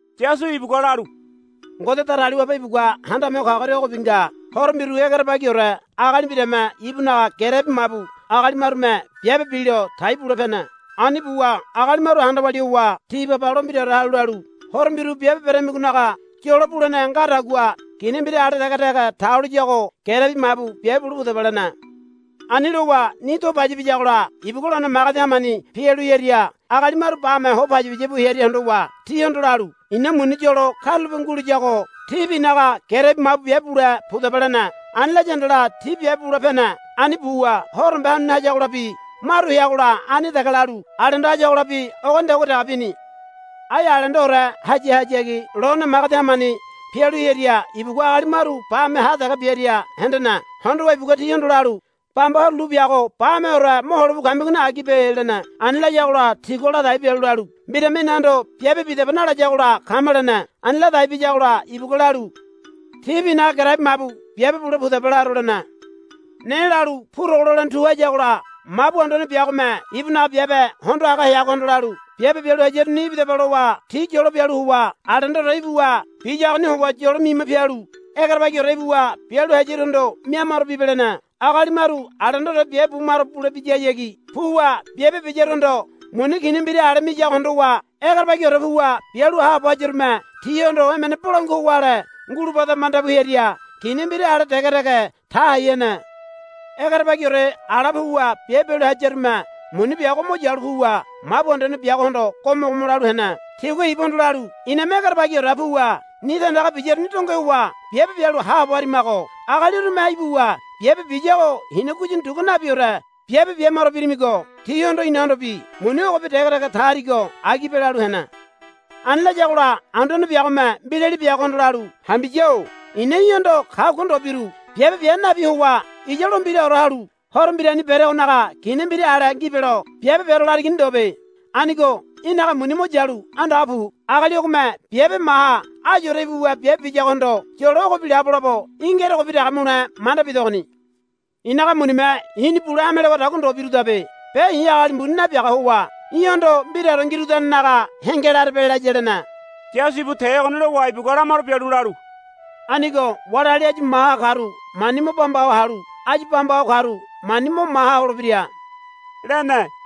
Yasu ibugua lalu, Ngode Datagaliwabe ibugua Handame Ho Kagoria ogobi nga. Horo mbiru egerebagiore agali mbirame ibunaga gerebi mabu agali marume biabe bilo tai bule pene. Ani buwa agali maru handa walia howa ti baba lo mbiraore halu lalu, Horo mbiru biabe beramigonaga yolo bulene ngadagua kina mbira ale dege dege ta holiyago gerebi mabu biabe bule pudaba, lene. Ani lowa ni do paya biyagola ibugua lone magedi hamani pialu hearia agali maru bame ho payapaya bu hearia hondowa tihondo lalu, I̱na muni yolo karulape nguliyago tíbi i̱naga gerebi mabu biabe bule pudaba, lene. Ani laya handala ti biabe bule pene. Ani buwa horombe hanuni hayagolabi maru heagola ani dege lalu alendo hayagolabi ogonidagua dege bini. Ai alendoore hayahayagi lone magedi hamani pialu hearia ibugua agali maru bame ha dege biaria hendene. Hondowa ibugua tihondo lalu, Bamba horo lu biago bameore mohole bu kamigoni agibe, lene. Ani layagola tigua ladai bialu lalu, Mbirame inahondo biabe bidaba nalayagola kama, lene. Ani ladai biyagola ibugua lalu, Tíbi i̱naga gerebi mabu biabe bule pudaba laro, lene. Ne lalu purogo lolene tu hayagola mabu anduane biagome ibunaga biabe hondo haga heagohondo lalu, Biabe bialu hayaruni ibidaba lowa ti yolo bialu howa alendoore ibuwa biyagoni howa yolo mima pialu egerebagiore ibuwa bialu hayaruhondo mia maro bibe, lene. Agali maru alendoore biabe bu maro bulebiyahayagi puwa biabe biyaruhondo muni kina mbira ale miyago hondowa egerebagiore puwa bialu haabo hayarume tihondo emene bolangua howa ale ngulubada manda bu hearia kina mbira ale dege dege ta hai hene. Egerebagiore ala puwa biabe bialu hayarume muni biago mo yalu puwa mabu anduane biagohondo go̱mo̱go̱mo̱ lalu hene. Tigua ibuhondo lalu, Iname egerebagiore puwa ni tandaga biyaruni donge howa biabe bialu haabo harimago. Agali urume ibuwa biabe biyago hina guyini dugua nabiaore biabe bia maro birimigo tihondo inahondobi muni ogobi dege dege ta harigo agibe, lalu hene. Ani layagola anduane biagome mbirali biagohondo lalu, Hambiya-o i̱na í̠hondo kagua ndo biru. Biabe bia nabi howa iya lo mbiraore halu horo mbirani beregonaga kina mbira ale ngibelo biabe bero larigoni ndobe. Anigo í̠naga muni mo yalu andaga pu. Agali ogome biabe maha ayuore ibuwa biabe biyagohondo yolo ogobi labolabo í̠ ngerogobi dege mule manda bidogoni. I̱naga munime i̱ni bule hame lewadagua ndo birudabe. Be i̱ agali mbuni nabiaga howa í̠hondo mbiraore ngirudanenaga henge larebe, laya, lene. Yasu ibu te ogoni lowa ibugua lamaro bialu lalu, Anigo wali agali áyu maha karu mani mo bamba ho halu áyu bamba ho karu mani mo maha holebira, lene.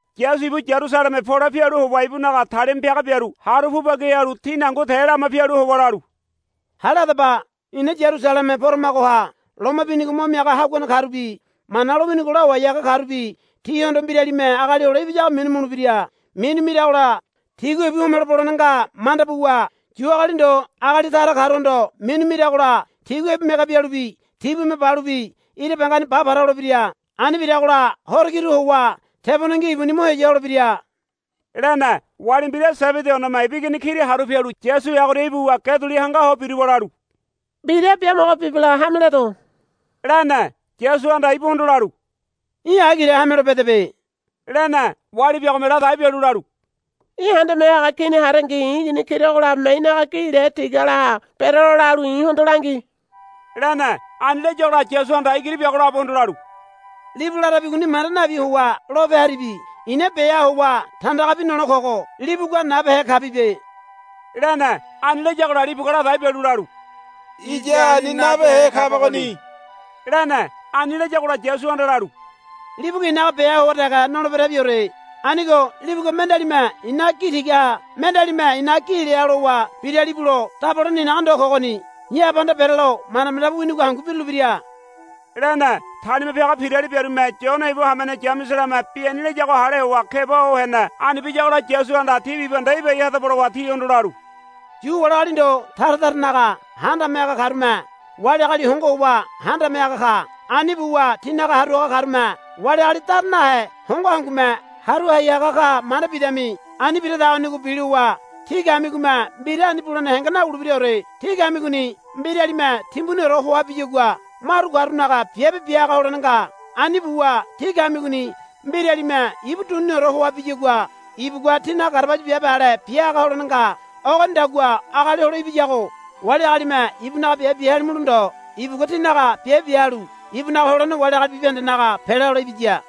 Yasu ibu Yarusaleme pole pialu howa ibunaga talima piaga biaru haru pu bagi halu tini hangu te lama pialu howa lalu, Hale hadaba. Ina Yarusaleme poramagoha loma binigo mo miaga haguane karubi Mana lowinigo lawai haga karubi tihondo mbiralime Agali Hole Ibiyago minu mulebira. Minu miragola tigua ibu homelo bolene nga manda buwa Yu agali ndo agali tara karuhondo minu miragola tigua ibu mege bialubi tibume balubi ira bangani ba para holebira. Ani biragola horo kiru howa tebonengi ibuni mo heya holebira, lene. Wali mbira Sebedi oneme ibu igini kira haru pialu Yasu heagoria ibuwa ge duli hanga ho biruwa lalu, Mbira biamogo bibelo hame ledo, lene. Yasuhanda ibuhondo lalu, Í̠ agile hamelo bedebe, lene. Wali biagome ladai bialu lalu, Í̠ Handame Haga Kini harengi i̱ igini kira ogolabome í̠naga gi le tigalaha berelo lalu i̱hondo langi, lene. Ani layagola Yasuhanda igiri biago labohondo lalu, Libu larabigoni manda nabi howa lope harabi. I̱na beha howa tandagabi nole kogo libugua nabehe kabibe, lene. Ani layagola libugua ladai bialu lalu, Iya ani nabehe kabagoni, lene. Ani layagola Yasuhanda lalu, Libugua i̱naga beha howa dege noleberabiore. Anigo libugua mendealime i̱naga gi tigaha mendealime i̱naga gi leha lowa biralibulo dabolene i̱naga ndo kogoni. I̱ Abahanda berelo manda manda bu winigo hangu birulebira, lene. Talima piaga pirali biarume Yone ibu hamene Yameselame bi ani layago hale howa keba ho hene. Ani biyagola Yasuhanda, Tí bibahende ibai hadaba, lowa tihondo lalu, Yu wali agali ndo tara taranaga handame haga karume wali agali hongo howa handame haga ka. Ani buwa tinaga haru haga karume wali agali dara nahe hongo hangume haru hai haga ka manda bidami. Ani biradagonigo bilowa tí kamigome mbira ani bulene henge nawulebiraore. Tí kamigoni mbiralime timbuniore hoa biyagua maru karunaga biabe bia haga holene nga. Ani buwa tí kamigoni mbiralime ibu duniniore hoa biyagua ibugua tínaga garabaya biabe ale bia haga holene nga. Ogonidagua Agali Hole Ibiyago wali agalime ibunaga biabe bia halimulo ndo ibugua tinaga biabe bia halu ibunaga holene wali agali bibahendenaga pela hole ibiya,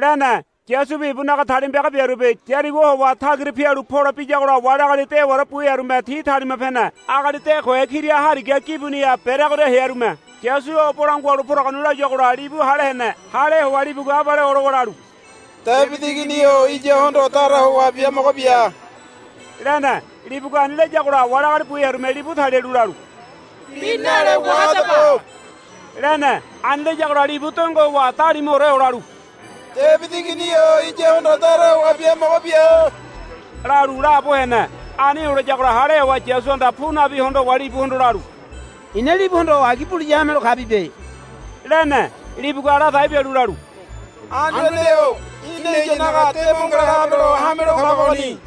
lene. Yasubi ibunaga talima piaga biarubi Yarigo howa tagira pialu pole biyagola wali agali dewaore bu hearume ti talima pene. Agali de kohe kira hariga gibuniha bereagoria hearume, Yasu o bolangua halu poragoni, layuagola libu hale hene. Hale howa libugua abale olowa lalu, Debidi Igini-o iyahondo dara howa biamogo bia, lene. Libugua ani layagola wali agali bu hearume libu talialu lalu, Bi nale wahadaba, lene. Ani layagola libu donge howa dalimuore olalu, Debidi Igini-o iyahondo dara howa biamogo bia, lalu laabo hene. Ani olayagola hale howa Yasuhanda pu nabi hondo howa libuhondo lalu, I̱na libuhondo agi buliya hamelo kabibe, lene. Libugua ladai bialu lalu, Anduane-o í̠na iyanaga de mo ngala habelo hamelo kabagoni,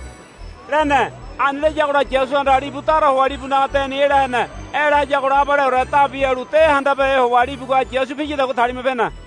lene. Ani layagola Yasuhanda libu dara howa libunaga deni ela hene. Ela hayagola abaleore dabi halu de handabehe howa libugua Yasu piyadagua talima pene.